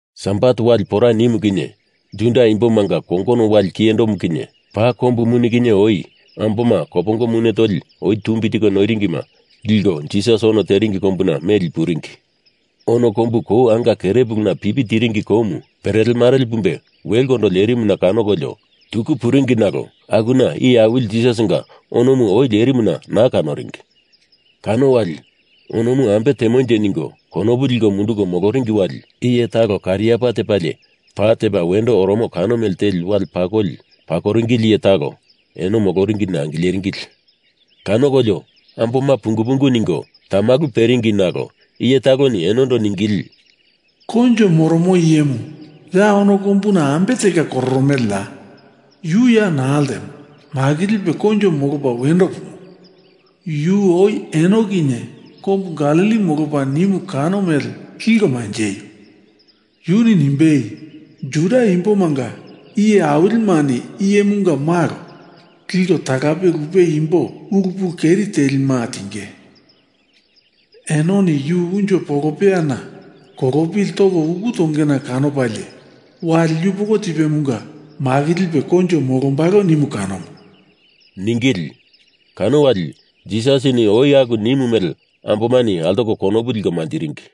Sabat wali pora nimu kinye Juda Imbomanga kongono wali kiyendo kinye, paa kombu muni kinye oi amboma kopongo mune toli oi tumbi tiko noiringima liko Jisas ono teringi kombuna meli puringi. Ono kombu kou anga kerepulu pipi tiringi koumu perele marele pumbe welekondo lerimuna kanokolio, tuku puringi nalo akuna Iye Awili Jisasinga onomu oi lerimuna naa kanoringi. Kano wali onomu ambe temonje ningo konopu liko munduko moloringi wali iye talo kariapa tepalie pa tepa wendo oromo kano mele teli wale pakoli pakoringili iye talo eno moloringina angileringili. Kanokolio amboma pungu pungu ningo tamalu peringi nalo iye taloni enondo ningili, “Koinjo moromo iyemu ya ono kombuna ambe telka kororomeleya? Yu ya naa ltemo. Makilipe koinjo molopa wendo pumo. Yu oi eno kinye Kombu Galili molopa nimu kano mele liko manjeio! Yuni nimbei, Juda Imbomanga iye awilimani Iyemunga Malo liko talape lupe imbo ulu pulu keri telima tinge, enoni yu unjo polopeyana kolopili toko uku tongena kolopalie, wali yupoko tipemunga makilipe koinjo molombalo nimu kanomu,” ningili. Kano wali Jisasini oi aku nimu mele ambomani altoko konopu liko manjiringi.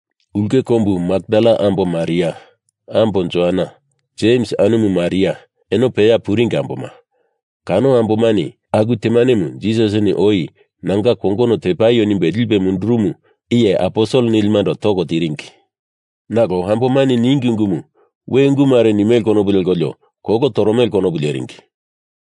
Ulke kombu Makdala ambo Maria, ambo Joana, Jems anumu Maria, eno peya puringi amboma, kano ambomani aku temanemu Jisasini oi nanga kongono tepaio nimbe lipe mundurumu iye aposel nilimando toko tiringi. Nalo ambomani ningi ungumu we ungu mare nimele konopu lekolio kolo toromele konopu leringi.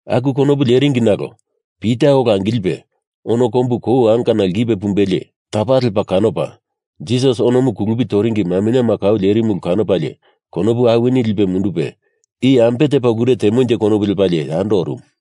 Aku konopu leringi nalo Pita ola angilipe ono kombu kou angana lkipe pumbelie, tapa lepa kanopa Jisas onomu kulupi toringi maminyema kau lerimu ulu kanopalie konopu awini lipe mundupe i ambe tepa ulure temonje konopu lepalie yando orumu.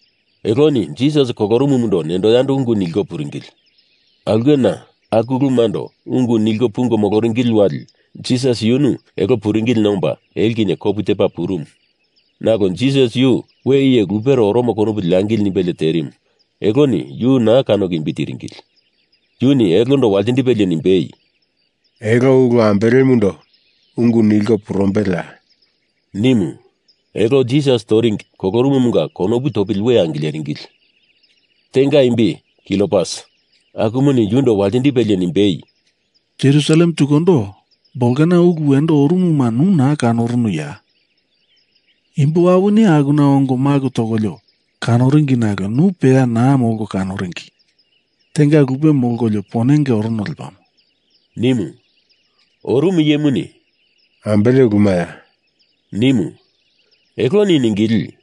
Eloni Jisas kolorumumundo nendo yando ungu nilko puringili. Aulkena aku ulumando ungu nilko pungo moloringili wali Jisas yunu elo puringilina omba elo kinye kopu tepa purumu, nalo Jisas yu we iye lupere oromo konopu leangili nimbelie terimu eloni yu naa kanoko imbi tiringili. Yuni elondo waltindipelie nimbei, “Elo ulu ambelemundo ungu nilko purumbeleya?” nimu. Elo Jisas toringi kolorumumunga konopu topili we angileringili. Tenga imbi Kliopas, akumuni yundo waltindipelie nimbei, “Jerusalem tukundo bolkena ulu wendo orumuma nu naa kanorunuya? Imbo awini akuna ongo maku tokolio kanoringi nalo nu peya naa molko kanoringi. Tenga lupe molkolio ponenge orono lepamo,” nimu. Orumu iyemuni, “Ambele ulumaya?” nimu. Eloni ningili,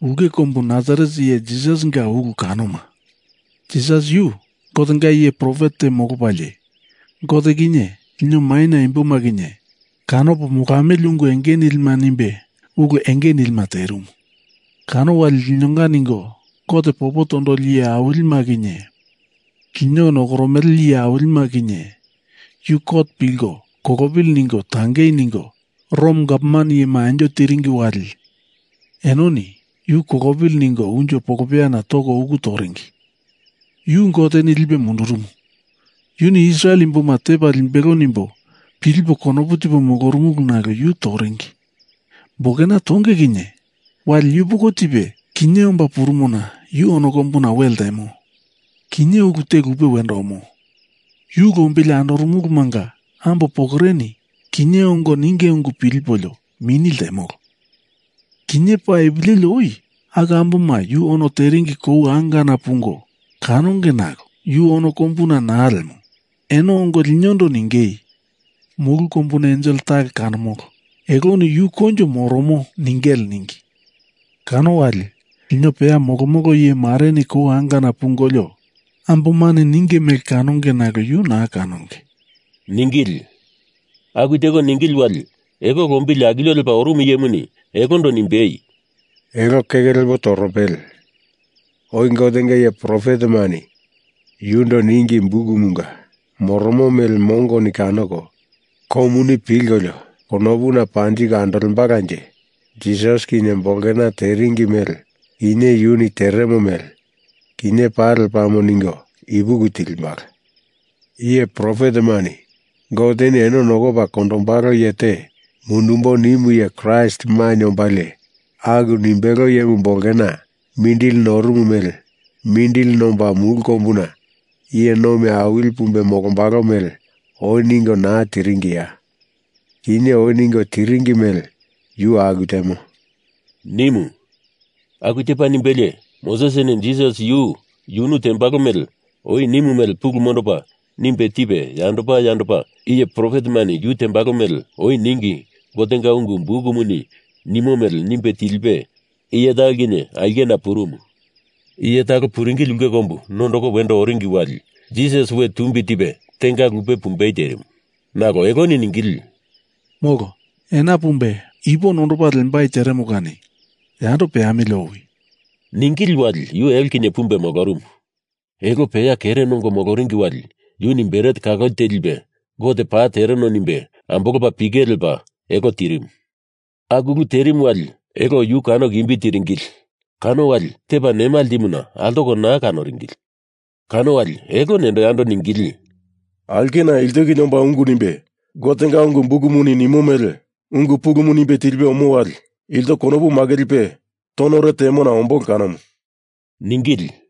“Ulke kombu Nasaret iye Jisasinga ulu kanoma. Jisas yu Gotenga iye profet te molopalie Gote kinye lino maina imboma kinye kanopo molamili ungu enge nilima nimbe ulu enge nilima terimu. Kano wali linonga ningo Gote popo tondoli iye awilima kinye lino nokoromele iye awilima kinye Yu kot pilko kolopili ningo tangei ningo Rom gavman iyema anjo tiringi wali enoni yu kolopili ningo unjo polopeyana toko uku toringi. Yu Goteni lipe mundurumu, yuni Israel imboma tepa limbelo nimbo pilipo konopu tipo molorumulu nalo yu toringi. Bolkena tonge kinye, wali yupoko tipe kinye omba purumona yu ono kombuna we ltemo. Kinye ulu te lupe wendo omo. Yu lombili andorumulumanga ambo pokoreni kinye ongo ninge ungu pilipolio mini ltemolo. Kinye paa ipu leli oi aku amboma yu ono teringi kou angana pungo kanonge nalo yu ono kombuna naa lemo. Eno ongo linondo ningei, ‘Mulu kombuna ensel talo kanomolo, eloni Yu koinjo moromo,’ ningele ningi. Kano wali lino peya molomolo iye mareni kou angana pungolio ambomani ninge mele kanonge, nalo yu naa kanonge,” ningili. Aku teko ningili wali elo lombili akilio lepa orumu iyemuni elondo nimbei, “Elo keke lepo torombele. Oi Gotenga iye profetemani yundo ningi bukumunga moromo mele mongoni kanoko komuni pilkolio konopuna panjiko andolembalanje Jisas kinye bolkena teringi mele kinye yuni teremo mele kinye paa lepamo ningo ipuki tilimbala. Iye profetemani Goteni eno nokopa kondombalo iye te mundumbo nimu iye Kraist mainye ombalie, aku nimbele iyemu bolkena mindili norumu mele mindili nomba mulu kombuna iye nomi awili pumbe molombalo mele oi ningo naa tiringiya? Kinye oi ningo tiringi mele yu aku temo,” nimu. Aku tepa nimbelie Mosesini Jisas yu yunu tembalo mele oi nimu mele pulu mondopa nimbe tipe yandopa yandopa iye profetemani yu tembalo mele oi ningi Gotenga ungu bukumuni nimo mele nimbe tilipe iye talo kinye aulkena purumu. Iye talo puringili ulke kombumu nondoko wendo oringi wali Jisas we tumbi tipe tenga lupe pumbei terimu. Nalo eloni ningili, “Molo, ena pepumbe ipu nondopa lembai teremo kani yando peamili owi,” ningili wali yu elo kinye pumbe molorumu. Elo peya kere nongo moloringi wali yuni bret kaloli te lipe Gote paa tereno nimbe, ambolopa pike lepa elo tirimu. Aku ulu terimu wali elo yu kanoko imbi tiringili kano wali tepa nema ltimuna altoko naa kanoringili. Kano wali elo nendo yando ningili, “Aulkena ilto kinye omba ungu nimbe Gotenga ungu bukumuni nimo mele ungu pulumu nimbe tilipe omo wali ilto konopu makilipe tonore temona ombolo kanomu,” ningili.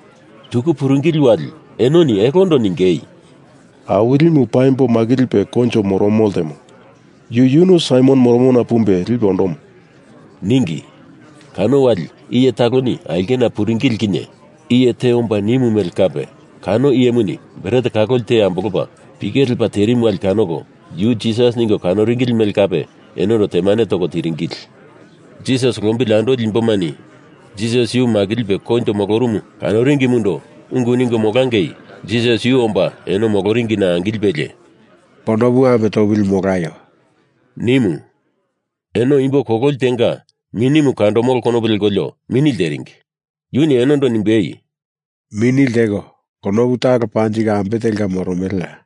Tuku puringili wali enoni elondo ningei, “Awilimu paimbo makilipe koinjo moromu ltemo. Yu yunu Saimon moromona pumbe lipe ondomo,” ningi. Kano wali iye taloni aulkena puringili kinye iye te omba nimu mele kape kano iyemuni bret kaloli te ambolopa pike lepa terimu wali kanoko yu Jisas ningo kanoringili mele kape enondo temane toko tiringili. Jisas lombili andoli imbomani Jisas yu makilipe koinjo molorumu kanoringimundo ungu ningo molangei Jisas yu omba eno moloringina angilipelie “Konopu ame topili molaio,” nimu. Eno imbo kololi tenga minimu kandomolo konopu lekolio mini lteringi. Yuni enondo nimbei, “Mini lteko konopu talo panjiko ambe telka moromeleya?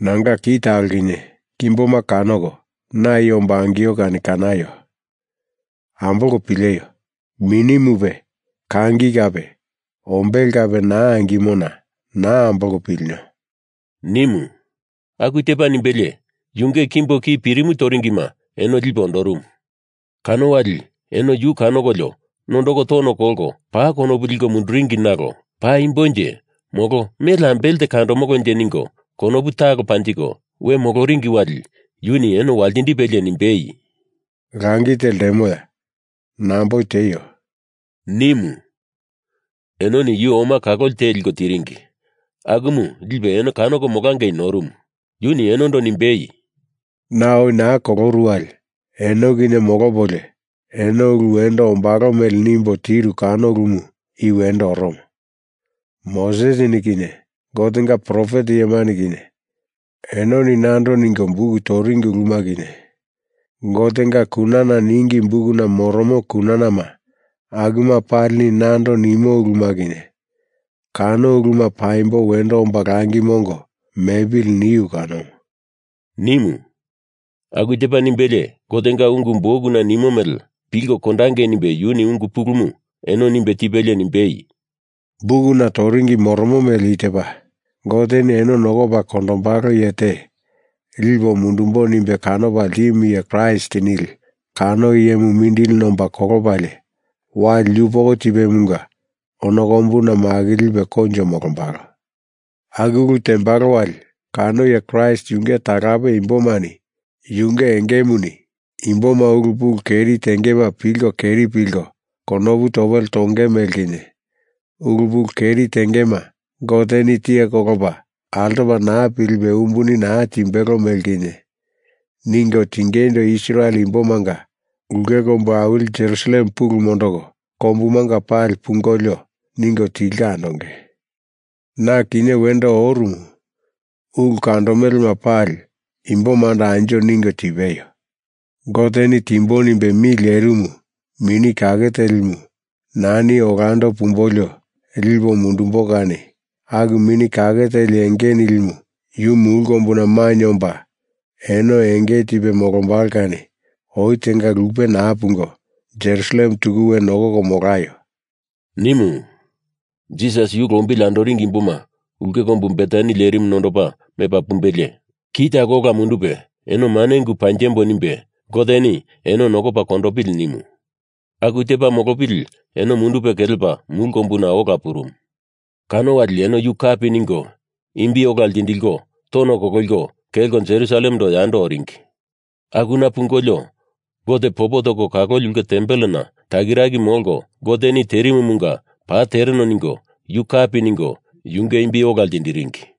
Nanga ki talo kinye kimboma kanoko na i ombo angio kani kanaio! Ambolko pileio. Minimupe, kangi kape ombele kape naa angimona naa ambolko pilino,” nimu. Aku tepa nimbelie yunge kimbo ki pirimu toringima eno lipe ondorumu. Kano wali eno yu kanokolio nondoko tono kolko paa konopu liko munduringi nalo paimbonje molo mele ambele te kandomolonje ningo konopu talo panjiko we moloringi wali yuni eno waltindipelie nimbei, “Langi te ltemoya? Namboi tieio,” nimu. Enoni yu oma kaloli te liko tiringi, akumu lipe eno kanoko molangei norumu. Yuni enondo nimbei, “Na oi naa koloru wali eno kinye molopolio eno ulu wendo ombalo mele nimbo tiru kano ulumu i wendo oromo. Mosesini kinye Gotenga profet iyemani kinye enoni nando ningo buk toringi uluma kinye, Gotenga kunana ningi bukuna moromo kunanama akuma palini nando nimo uluma kinye, kano uluma paimbo wendo omba langi mongo mepili niu kanomu,” nimu. Aku tepa nimbelie Gotenga ungu bukuna nimo mele pilko kondangei nimbe yuni ungu pulumu eno nimbe tipelie nimbei, “Bukuna toringi moromo mele i tepa: Goteni eno nokopa kondombalo iye te lipo mundumbo nimbe kanopa ltimu iye Kraist nili kano iyemu mindili nomba kolopalie wali yupoko tipemunga ono kombuna makilipe koinjo molombalo. Aku ulu tembalo wali kano iye Kraist yunge talape imbomani yunge engemuni imboma ulu pulu keri tengema pilko keri pilko konopu topele tonge mele kinye, ulu pulu keri tengema Goteni tiye kolopa altopa naa pilipe umbuni naa timbelo mele kinye, ningo tingeindo Israel imbomanga ulke kombu awili Jerusalem pulu mondoko kombumanga pali pungolio ningo tilko andonge. Na kinye wendo orumu ulu kandomelema pali imbomando anjo ningo tipeio. Goteni timbo nimbe mi lerimu Mini Kake Telimu nani olando pumbolio lipo mundumbo kani aku Mini Kake Teli enge nilimu yu mulu kombuna mainye omba eno enge tipe molombalo kani oi tenga lupe naa pungo, Jerusalem tuku we nokoko molaio,” nimu. Jisas yu lombili andoringi imboma ulke kombu Betani lerimuna nondopa mepa pumbelie, ki talo ola mundupe eno mane ungu panjembo nimbe Goteni eno nokopa kondopili nimu. Aku tepa molopili eno mundupe kelepa mulu kombuna ola purumu. Kano wali eno yu kapi ningo imbi ola ltindikolio tono kololiko kelko Jerusalemando yando oringi. Akuna pungolio Gote popo toko kaloli ulke tempelena takiraki molko, Goteni terimumunga paa tereno ningo yu kapi ningo yunge imbi ola ltindiringi.